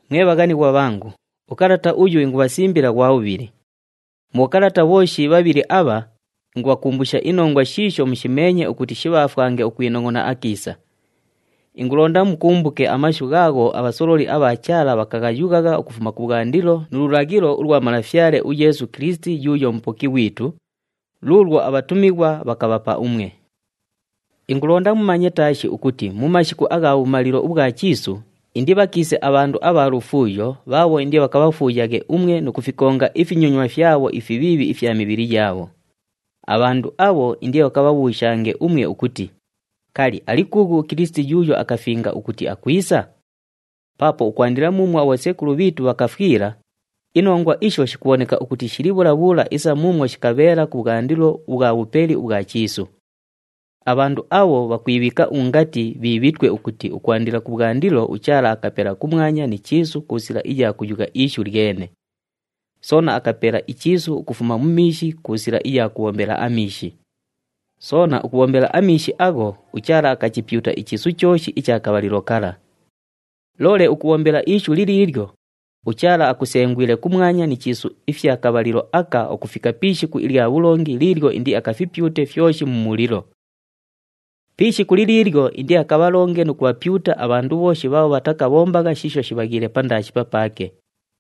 Mwe bhaghanighwa bhangu, ukalata uyu ingubhasimbila ghwa bhubhili. Mu bhokalata bhooshi bhabhili abha, ingubhakumbusha inongwa shiisho mushimeenye ukuti shibhaafwange ukwinongʼona akiisa. Ingulonda mukumbuke amashu ghaagho abhasololi abha Chaala bhakaghayughagha ukufuma kubhwandilo nu lulaghilo ulwa Malafyale uYeesu Kilisiti yuuyo Mupoki ghwitu, luulwo abhatumighwa bhakabhapa umwe. Ingulonda mumanye taashi ukuti mu mashiku agha bhumalilo ubhwa chiisu, indibhakiise abhandu abha lufuuyo bhaabho indibhakabhafuuyaghe umwe nu kufikonga ifinyonywa fyabho ifibhiibhi ifya mibhili yaabho. Abhandu abho indibhakabhabhuushange umwe ukuti, “Kali, ali kuughu uKilisiti yuuyo akafinga ukuti akwisa?” Paapo ukwandila muumwo abhosekulu bhiitu bhakafwila, inongwa isho shikubhoneka ukuti shili bhula bhula isa muumwo shikabheela kubhwandilo ubhwa bhupeli ubhwa chiisu. Abhandu abho bhakwibhiika ungati bhiibhitwe ukuti ukwandila kubhwandilo uChaala akapela kumwanya ni chiisu ku sila iya kuyugha ishu lyene. Soona akapela ichiisu ukufuma mu miishi ku sila iya kubhombela amiishi. Soona ukubhombela amiishi agho, uChaala akachipyuta ichiisu chooshi icha kabhalilo kala. Loole ukubhombela ishu liliilyo, uChaala akusengwile kumwanya ni chiisu ifya kabhalilo aka ukufika pi ishiku ilya bhulongi liilyo indiakafipyute fyoshi mu mulilo. Pi ishiku liliilyo indiakabhalonge nu kubhapyuta abhandu bhooshi bhaabho bhatakabhombagha shiisho shibhaghiile pandaashi papaake.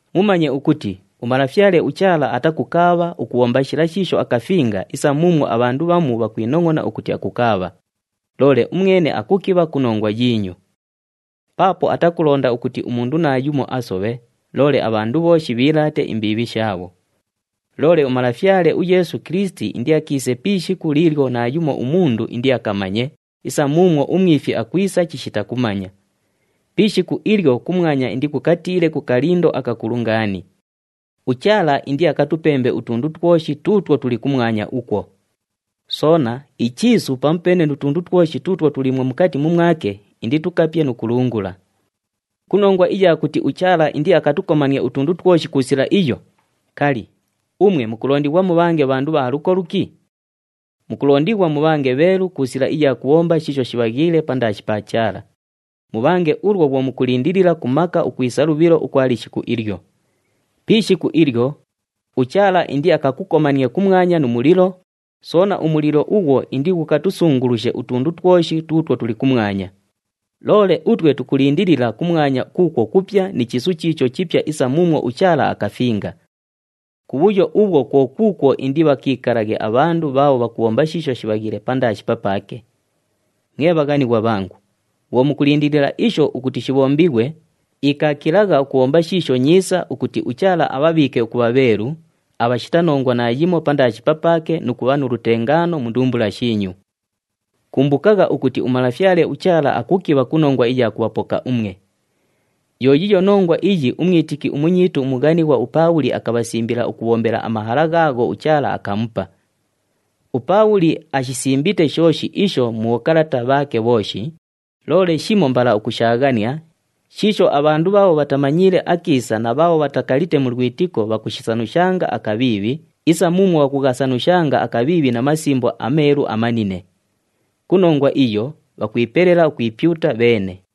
Mumanye ukuti uMalafyale uChaala atakukaabha ukubhomba shila shiisho akafinga isa muumwo abhandu bhamu bhakwinongʼona ukuti akukaabha, loole umwene akukibha ku nongwa yiinyu. Paapo atakulonda ukuti umundu naayumo asobhe, loole abhandu bhooshi bhiilaate imbiibhi shaabho. Loole uMalafyale uYeesu Kilisiti indiakiise pi ishiku liilyo naayumo umundu indiakamanye isa muumwo umwifi akwisa chishita kumanya. Pi ishiku ilyo kumwanya indikukatiile ku kalindo akakulu ngaani. UChaala indiakatupembe utundu twoshi tuutwo tuli kumwanya ukwo. Soona, ichiisu pamupeene nu tundu twoshi tuutwo tuliimwo mukati mumwake inditukapye nu kulungula. Ku nongwa iya kuti uChaala indiakatukomanie utundu twoshi ku sila iyo, kali, umwe mukulondighwa mubhange bhandu abha luko luki? Mukulondighwa mubhange bheelu ku sila iya kubhomba shiisho shibhaghiile pandaashi pa Chaala. Mubhange ulwo bhwo mukulindilila ku maka ukwisa lubhilo ukwa lishiku ilyo. Pi ishiku ilyo, uChaala indiakakukomanie kumwanya nu mulilo, soona umulilo ughwo indighukatusungulushe utundu twoshi tuutwo tuli kumwanya. Loole utwe tukulindilila kumwanya kuukwo kupya ni chiisu chiicho chipya isa muumwo uChaala akafinga. Kubhuyo ubhwo kwo kuukwo indibhakiikalaghe abhandu bhaabho bhakubhomba shiisho shibhaghiile pandaashi papaake. Mwe bhaghanighwa bhangu, bhwo mukulindilila isho ukuti shibhombighwe, ikaakilagha ukubhomba shiisho nyiisa ukuti uChaala abhabhiike ukubha bheelu, abhashita nongwa naayimo pandaashi papaake nu kubha nu lutengaano mu ndumbula shiinyu. Kumbukagha ukuti uMalafyale uChaala akukibha ku nongwa iya kubhapoka umwe. Yo yiiyo nongwa iyi umwitiki umunyiitu umughanighwa uPaabhuli akabhasimbila ukubhombela amahala ghaagho uChaala akamupa. UPaabhuli ashisimbite shooshi isho mu bhokalata bhaake bhooshi, loole shimo mbala ukushaaghania, shiisho abhandu bhaabho bhatamanyiile akiisa na bhaabho bhatakalite mu lwitiko bhakushisanushanga akabhiibhi, isa muumwo bhakughasanushanga akabhiibhi na Masimbo aMeelu amanine. Ku nongwa iyo, bhakwipelela ukwipyuta bheene.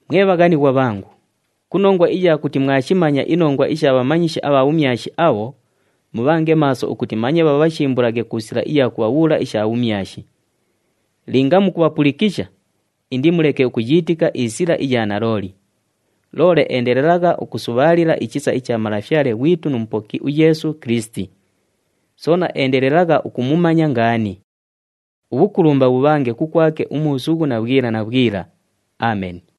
Mwe bhaghanighwa bhangu, ku nongwa iya kuti mwashimanya inongwa isha bhamanyishi abha bhumyashi abho, mubhange maaso ukuti manye bhabhashimbulaghe ku sila iya kubhabhuula isha bhumyashi. Linga mukubhapulikisha, indimuleke ukuyiitika isila iya nalooli. Loole endelelagha ukusubhaalila ichisa icha Malafyale ghwitu nu Mupoki uYeesu Kilisiti. Soona endelelagha ukumumanya ngaani. Ubhukulumba bhubhange kukwake umuusughu na bhwila na bhwila. Ameni.